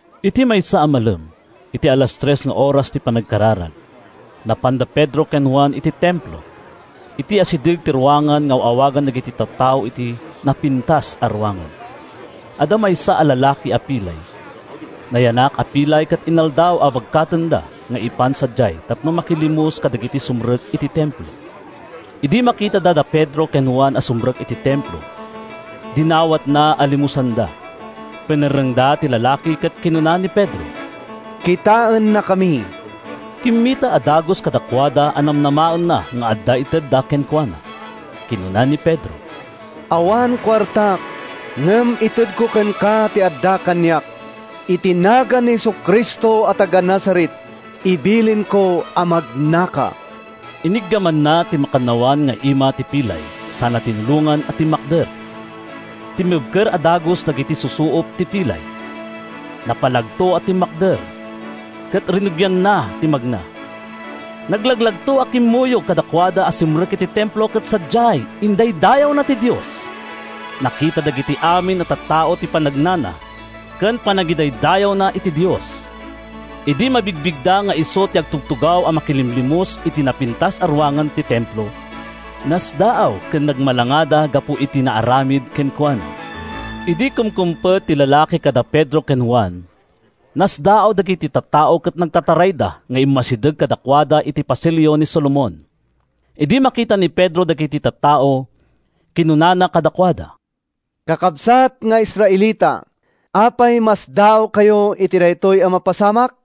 Iti maysa a malem, iti alas tres nga oras ti panagkararag, napan da Pedro ken Juan iti Templo. Iti asideg ti ruangan nga aw-awagan dagiti tattao iti “Napintas a Ruangan,” adda maysa a lalaki a pilay. Nayanak a pilay ket inaldaw a bagkatenda nga ipan sadiay tapno makilimos kadagiti sumrek iti Templo. Idi makitana da Pedro ken Juan a sumrek iti Templo, dinawatna a limosanda. Pinerrengda ti lalaki ket kinuna ni Pedro, “Kitaennakami.” Kimmita a dagus kadakuada a namnamaenna nga adda itedda kenkuana. Kinuna ni Pedro, “Awan kuartak, ngem itedko kenka ti adda kaniak: iti nagan ni Jesu-Cristo a taga-Nazaret, ibilinko a magnaka!” Iniggamanna ti makannawan nga ima ti pilay sana tinulongan a timmakder. Timmibker a dagus dagiti susuop ti pilay; napalagto a timmakder, ket rinugianna ti nagna. Naglaglagto a kimmuyog kadakuada a simrek iti Templo ket sadiay, indaydayawna ti Dios. Nakita dagiti amin a tattao ti pannagna ken panangidaydayawna iti Dios. Idi mabigbigda nga isu ti agtugtugaw a makilimlimos iti “Napintas a Ruangan” ti Templo, nasdaaw ken nagmalangada gapu iti naaramid kenkuana. Idi kumkumpet ti lalaki kada Pedro ken Juan, nasdaaw dagiti tattao ket nagtatarayda nga immasideg kadakuada iti Pasilio ni Solomon. Idi makita ni Pedro dagiti tattao, kinunana kadakuada, “Kakabsat nga Israelita, apay a masdaawkayo iti daytoy a napasamak?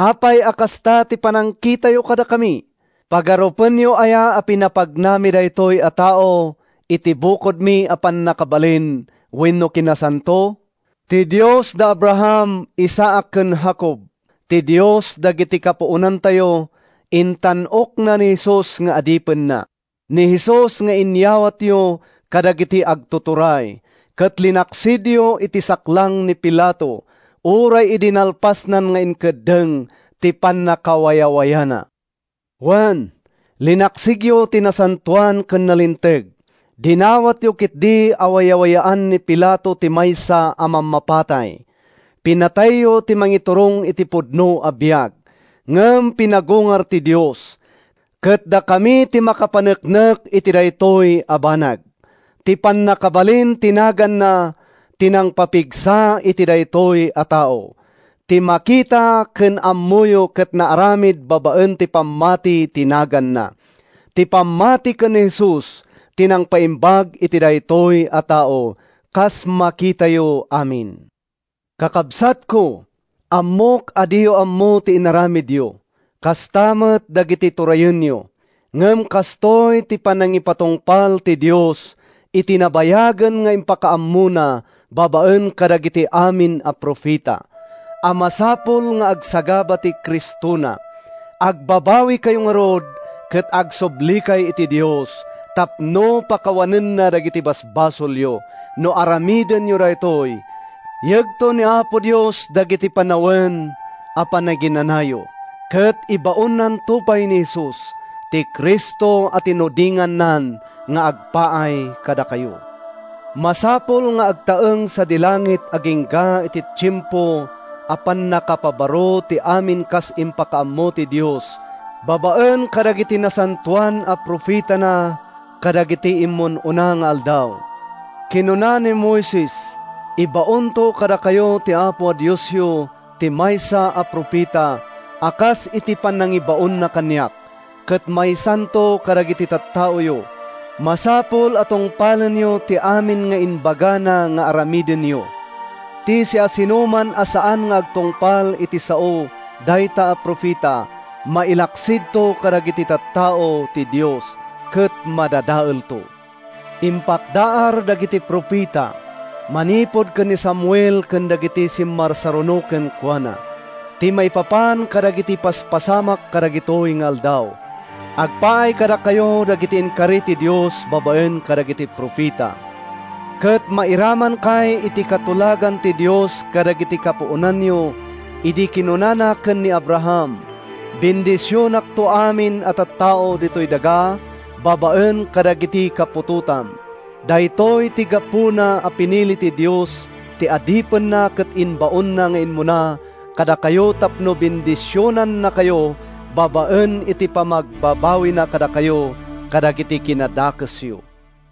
Apay a kasta ti panagkitayo kadakami? Pagarupenyo aya a pinapagnami daytoy a tao iti bukodmi a pannakabalin wenno kinasanto? Ti Dios da Abraham, Isaac ken Jacob—ti Dios dagiti kapuonantayo—intan-okna ni Jesus nga adipenna, ni Jesus nga inyawatyo kadagiti agtuturay, ket linaksidyo iti saklang ni Pilato uray idi nalpasnan nga inkeddeng ti pannakawayawayana. Wen, linaksidyo ti Nasantoan ken Nalinteg. Dinawatyo ketdi a wayawayaan ni Pilato ti maysa a mammapatay. Pinatayyo ti mangiturong iti pudno a biag, ngem pinagungar ti Dios, ket dakami ti makapaneknek iti daytoy a banag. Ti pannakabalin ti naganna ti nangpapigsa iti daytoy a tao. Ti makita ken ammoyo ket naaramid babaen ti pammati ti naganna; ti pammati ken ni Jesus ti nangpaimbag iti daytoy a tao kas makitayo amin. “Kakabsatko, ammok a diyo ammo ti inaramidyo, kasta met dagiti turayenyo. Ngem kastoy ti panangipatungpal ti Dios iti nabayagen nga impakaammona babaen kadagiti amin a profeta, a masapul nga agsagaba ti Cristona. Agbabawikayo ngarud ket agsublikay iti Dios tapno pakawanenna dagiti basbasolyo. No aramidenyo daytoy, yegto ni Apo Dios dagiti panawen a panaginanayo, ket ibaonnanto pay ni Jesus, ti Cristo a tinudingannan nga agpaay kadakayo. Masapul nga agtaeng sadi langit agingga iti tiempo a pannakapabaro ti amin kas impakaammo ti Dios babaen kadagiti nasantoan a profetana kadagidi immun-una nga aldaw. Kinuna ni Moises: ‘Ibaonto kadakayo ti Apo a Diosyo ti maysa a profeta a kas iti panangibaonna kaniak, ket maysanto kadagiti tattaoyo. Masapul a tungpalenyo ti amin nga ibagana nga aramidenyo. Ti siasinoman a saan nga agtungpal iti sao dayta a profeta, mailaksidto kadagiti tattao ti Dios ket madadaelto.’ Impakdaar dagiti profeta, manipud ken ni Samuel ken dagiti simmarsaruno kenkuana, ti maipapan kadagiti paspasamak kadagitoy nga aldaw. Agpaay kadakayo dagiti inkari ti Dios babaen kadagiti profeta, ket mairamankay iti katulagan ti Dios kadagiti kapuonanyo idi kinunana ken ni Abraham: ‘Bendisionakto amin a tattao ditoy daga babaen kadagiti kaputotam.’ Daytoy ti gapuna a pinili ti Dios ti Adipenna ket imbaonna nga immuna kadakayo tapno bendisionannakayo babaen iti panamagbabawina kadakayo kadagiti kinadakesyo.”